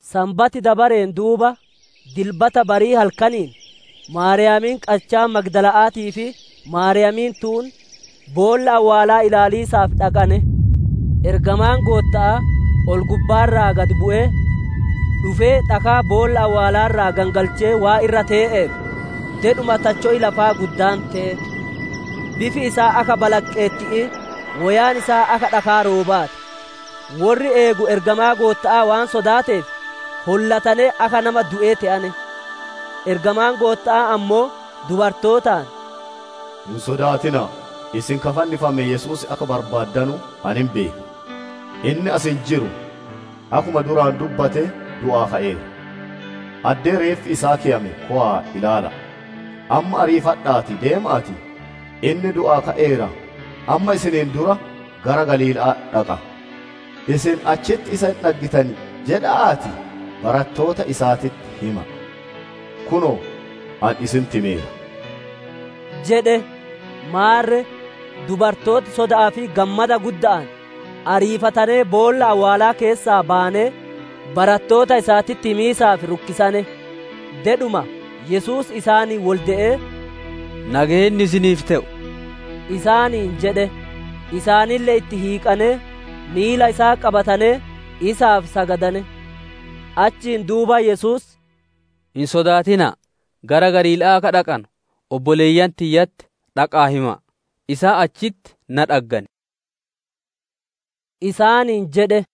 Sanbati dabareen duuba, Dilbata barii halkaniin, Maariyaamiin qachaa magdala'aatii fi Maariyaamiin tuun boolla awwaalaa ilaaliisaaf dhaqane. Ergamaan Gootta'aa ol-gubbaa irraa gad bu'ee, dhufee dhakaa boolla awwaalaa irraa gangalchee waan irra tee'eef, dedhuma tacho'i lafaa guddaan te'e. Bifi isaa akka balaqqeetti'ii, woyaan isaa adii akka dhakaa roobaa ti. Worri eegu ergamaa Gootta'aa waan sodaateef hollatanee akka nama du'ee te'ane. Ergamaan Gootta'aa ammoo dubartootaan, «Hin sodaatina'a; isin ka fannifame Yesuus akka barbaaddanu ani hin beeka. Inni as hin jiru; akkuma duraan dubbate du'aa ka'eera. Addee reeffi isaa keyame kowa'aa ilaala'a. Amma ariifadha'aatii deema'aatii, ‹Inni du'aa ka'eera, amma isiniin dura gara Galiila'aa dhaqa; isin achitti isa hin dhaggitan› jedha'aatii barattoota isaatitti hima'a. Kunoo, ani isinitti himeera» jedhe. Maarre dubartooti soda'aa fi gammada gudda'aan ariifatanee boolla awwaalaa keessaa bayanee, barattoota isaatitti himiisaaf rukkisane. Dedhuma Yesuus isaaniin wolde'ee, «Nageenni isiniif te'u!» isaaniin jedhe. Isaanille itti hiiqanee, miila isaa qabatanee, isaaf sagadane. Achiin duuba Yesuus, «Hin sodaatina'a; gara Galiila'aa akka dhaqanu obboleeyyan tiyyatti dhaqa'aa hima'a; isaan achitti na dhaggan» isaaniin jedhe.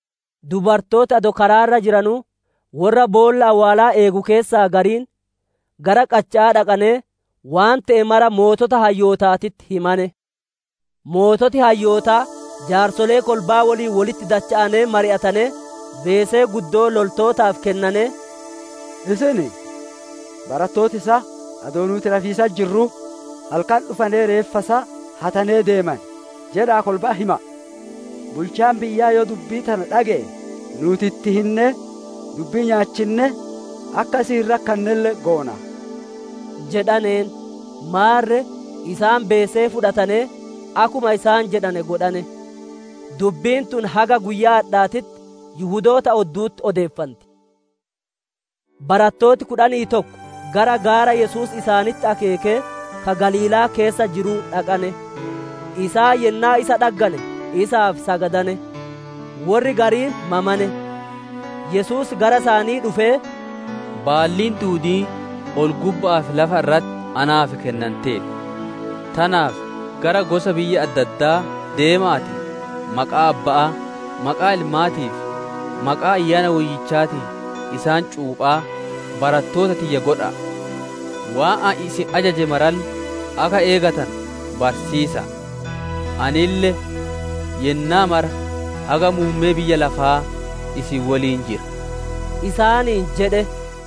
Dubartooti adoo karaa irra jiranuu, worra boolla awwaalaa eegu keessaa gariin gara qacha'aa dhaqanee waan te'e mara sooreyyii hayyootaatitti himane. Sooreyyiin hayyootaa jaarsolee kolba'aa woliin wolitti dacha'anee mari'atanee, beesee guddoo loltootaaf kennanee, «Isin, ‹Barattooti isaa adoo nuuti rafiisatti jirruu halkan dhufanee reeffa isaa hatanee deemane› jedha'aa kolba'atti hima'a. Bulchaan biyyaa yoo dubbii tana dhage'e, nuuti itti hinnee dubbii nyaachinnee, akka isin hin rakkannelle goona» jedhaneen. Maarre isaan beesee fudhatanee akkuma isaan jedhane godhane. Dubbiin tun haga guyyaa adhaatitti Yihudoota oddu'utti odeeffanti. Barattooti kudhanii tokko gara gaara Yesuus isaanitti akeekee, ka Galiilaa keessa jiruu dhaqane. Isaan yennaa isa dhaggane, isaaf sagadane; worri gariin mamane. Yesuus gara isaanii dhufee, «Baalliin duudiin ol-gubba'aa fi lafa irratti naaf kennanteerti. Tanaaf gara gosa biyya adda addaa deema'aatii maqaa Abba'aa, maqaa Ilmaatii fi maqaa Ayyaana Woyyichaatiin isaan cuuphaa, barattoota tiyya godha'a. Waan ani isin ajaje maralle akka eegatanu barsiisa'a. Anille yennaa mara haga muummee biyya lafaa isin woliin jira» isaaniin jedhe.